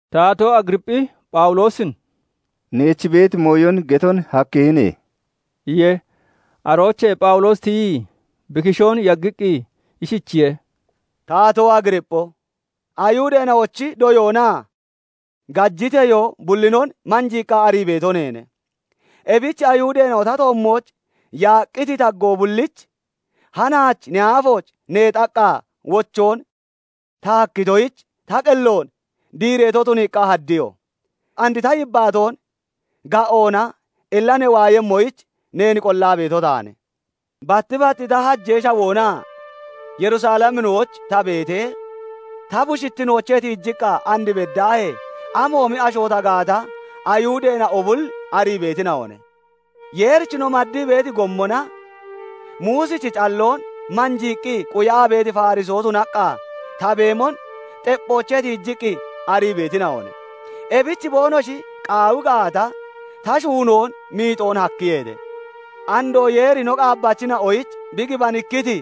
Taatoo Agiriipphi Phawuloosin "Neech beeti mooyon geton hakkihine" iye. Aroochee Phawuloosi tiyii, bi kishoon yaggiqqi ishichiye:- "Taatoo Agiriippho! Ayihudeena'ochi doyoonaa gajiteyoo bullinon manjiiqqa arii beeto neene; ebich Ayihudeena'o ta toommooch yaaqqiti taggoo bullich hanaach ne aafooch neexaqqa wochoon ta hakkitoyich, ta qelloon diireeto tuniiqqa haddiyo. And ta yibbaatoon ga'oona ella ne waayemmoyich, neen qollaa beeto taane. "Batti bat ta hajee shawoonaa Yerusaleminooch ta beetee, ta bushittinoochee tiijiqqa and beddaahee amoomi asho ta gaata, Ayihudeena'o bulli arii beetina'one. Yeerich no maddii beeti gommona Muusichi calloon manjiiqqi quyaa beeti Farisoo tunaqqa ta beemon xepphoochee tiijiqqi arii beetina'one; ebich boonoshi qaawi gaata, ta shuunoon miixoon hakkiyeete. Andoo Yeeri no qaabbachina'oyich bi gibanikkiti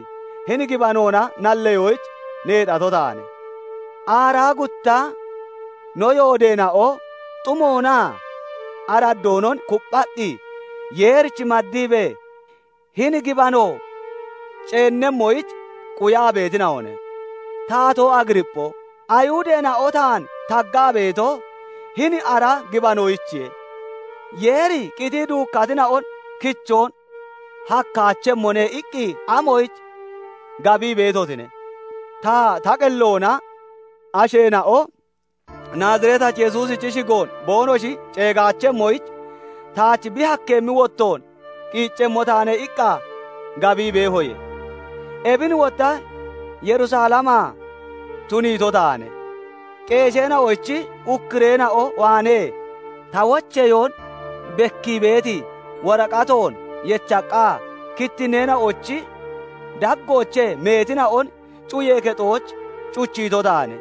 hini gibanoona nalleyoyich neexato taane. Aaraa gutta no yoodeena'o xumoonaa araddoonon kupphaqqi, Yeerich maddiibee hini gibano ceennemmoyich quyaa beetina'one. Taatoo Agiriippho! Ayihudeena'o taan taggaa beeto, hini ara gibanoyichiye. 'Yeeri qitii duukkatina'on kichoon hakkaachemmone' iqqi amoyich gabii beetotine? "Ta, ta qelloona 'Asheena'o Naaziretachi Yesuusichi shigoon boonoshi ceegaachemmoyich, taach bi hakkeemmi wottoon qiiccemmo taane' iqqa gabii beehoye. Ebin wotta Yerusalemaa tuniito taane; qeesheena'ochi ukkureena'o waanee ta wocheyoon bekkii beeti woraqatoon yechaqqa, kittinneena'ochi daggoochee meetina'on cuyee kexooch cuchiito taane.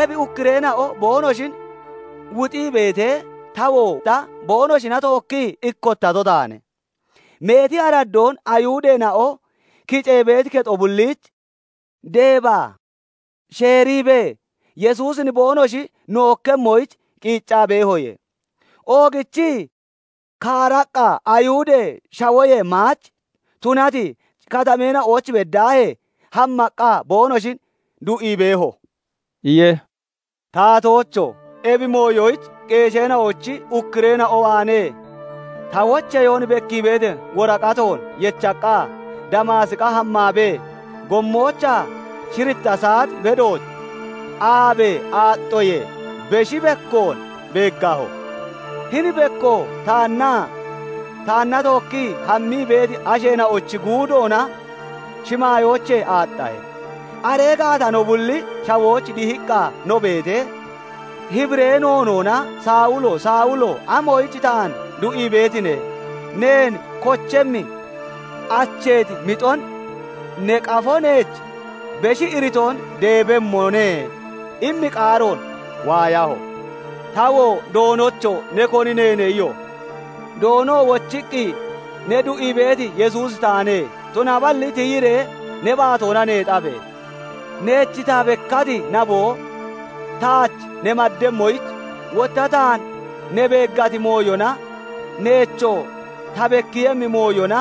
Ebi ukkureena'o boonoshin wuxii beetee, ta wotta boonoshina tookkii ikkottato taane. Meeti araddoon Ayihudeena'o kicee beeti kexo bulliich deebaa sheeriibee, Yesuusin boonoshi nookkemmoyich qiiccaa beehoye. Oogichii kaaraqqa Ayihudee Shawoyee maach tunati katameena'ooch beddaahee hammaqqa boonoshin du'ii beeho" iye. "Taatoocho! Ebi mooyoyich qeesheena'ochi ukkureena'o waanee ta wocheyoon bekkii beeti woraqatoon yechaqqa, Damaasiqa hammaabee, gommoochaa shiritta saat bedooch, aabee aaxxoyee beshi bekkoon beeggaho; hini bekkoo taannaa taanna tookkii hammii beeti asheena'ochi guudoona shimaayoochee aaxxahe. Aree gaata no bulli shawooch dihiqqa no beetee, Hibiree noonoona 'Sawulo! Sawulo! Amoyich taan du'ii beetine? Neen kochemmi acheeti mixon ne qafo neech beshi iritoon deebemmone' immi qaaroon waayaho. "Tawoo 'Doonocho! Ne koni neene?' iyo. "Doonoo wochiqqi, 'Ne du'ii beeti Yesuusi taane. Tunaballi tiyiree ne baatoona neexabe! Neech ta bekkati naboo, taach ne maddemmoyich, wotta taan ne beeggati mooyona, neechoo ta bekkiiyemmi mooyona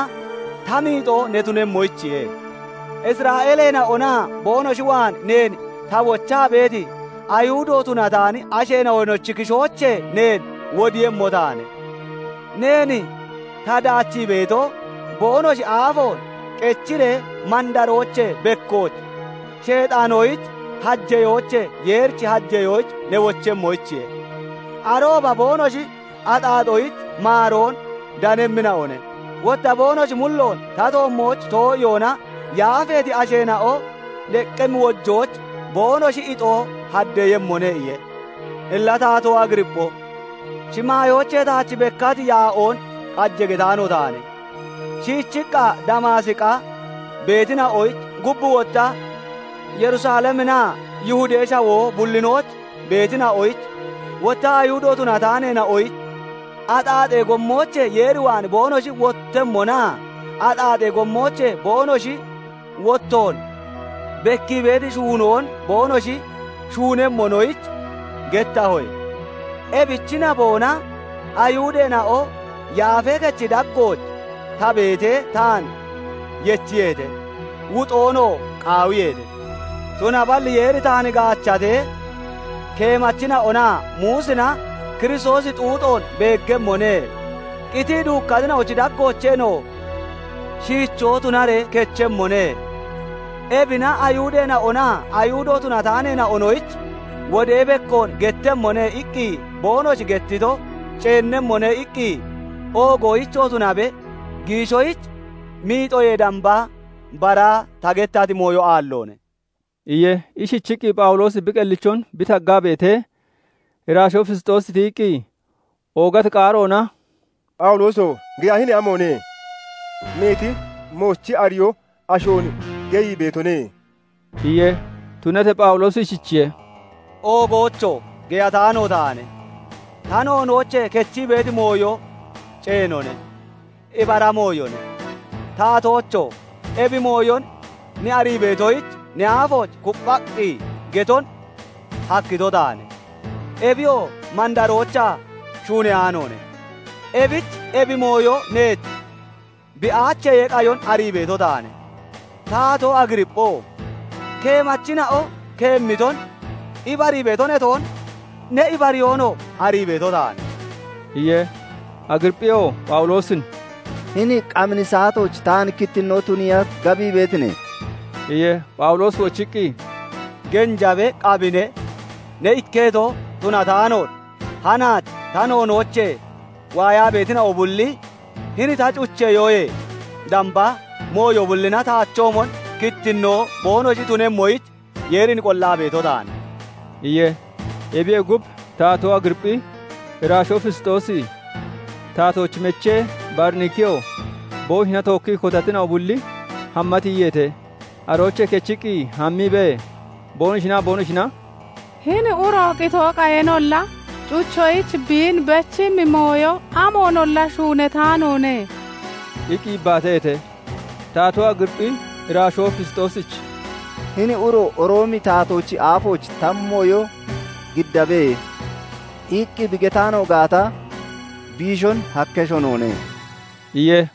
ta miixoo ne tunemmoyichiye. Isra'eeleena'onaa boonoshi waan neen ta wochaa beeti, Ayihudo tunataani asheena'onochi kishoochee neen wodiiyemmo taane. Neen ta daachii beeto, boonoshi aafoon qechiree mandaroochee bekkooch, Sheexaanoyich hajeyoochee Yeerich hajeyooch ne wochemmoyichiye. Arooba boonoshi axaaxoyich maaroon danemmina'o ne; wotta boonoshi mulloon ta toommooch too'iyoona yaafeeti asheena'o deqqemmi wojooch boonoshi ixoo haddeeyemmone' iye. "Illa Taatoo Agiriippho! Shimaayoochee taach bekkati yaa'oon qaje getaano taane. Shiichiqqa Damaasiqa beetina'oyich, gub wotta Yerusaleminaa Yihudee Shawoo bullinooch beetina'oyich, wotta Ayihudo tunataaneena'oyich axaaxee gommoochee Yeer waan boonoshi wottemmonaa axaaxee gommoochee boonoshi wottoon bekkii beeti shuunoon boonoshi shuunemmonoyich gettahoye. Ebichi naboona Ayihudeena'o Yaafee Kechi daggooch ta beetee, taan yechiyeete; wuxoonoo qaawiyeete. Tunaballi Yeeri taan gaachatee, 'Keemachina'onaa Muusina "Kiristoosi xuuxoon beeggemmone; qitii duukkatina'ochi daggoocheenoo shiichoo tunaree kechemmone; ebina Ayihudeena'onaa Ayihudo tunataaneena'onoyich wodee bekkoon gettemmone" iqqi boonoshi gettito ceennemmone' iqqi oogoyichoo tunabe, giishoyich miixoyee damba bara ta gettati mooyo aalloone" iye. Ishichiqqi Phawuloosi bi qellichon bi taggaa beetee, iraashoo Fisxoosi tiyiqqi, oogati qaaroona "Phawulooso! Geyahine amoone! Meeti moochi ariyoo ashoon geyii beetone" iye. Tunatee Phawuloosi ishichiye:- "Oogoocho! Geyataano taane; ta noonoochee kechii beeti mooyo ceenone; ibara mooyone. Taatoocho! Ebi mooyon ne arii beetoyich, ne aafooch kupphaqqi geton hakkito taane. Ebiyoo mandaroochaa shuuneyaanoone; ebich ebi mooyo neech bi aachiyee qayon arii beeto taane. Taatoo Agiriippho! Keemachina'o keemmiton ibarii beeto ne toon? Ne ibariyoonoo arii beeto taane" iye. Agiriipphiyoo Phawuloosin "Hini qamini saatooch taan kittinnoo tuniiya gabii beetine?" iye. Phawuloosi wochiqqi, "Genjabe, qamine, ne ikketo tunataanoon, hanaach ta noonoochee waayaa beetina'o bulli, hini ta cucheyoyee damba, mooyo bullina taachoomon kittinnoo boonoshi tunemmoyich, Yeerin qollaa beeto taane" iye. Ebiyee gub, Taatoo Agiriipphi, iraashoo Fisxoosi, taatoochi mechee Bariniikiyoo, boonoshina tookkii kotatina'o bulli hamma tiyiyeete. Aroochee kechiqqi hammiibee, boonoshinaa boonoshina "Hini uro qitoo qayeenolla cucheyoyich biin bechemmi mooyo amoonolla shuunataanoone" iqqi yibbaataheete. Taatoo Agiriipphi iraashoo Fisxoosich "Hini uro 'Roomi taatoochi aafooch ta mooyo giddabe!' iqqi bi getaano gaata, biishon hakkesho noone" iye.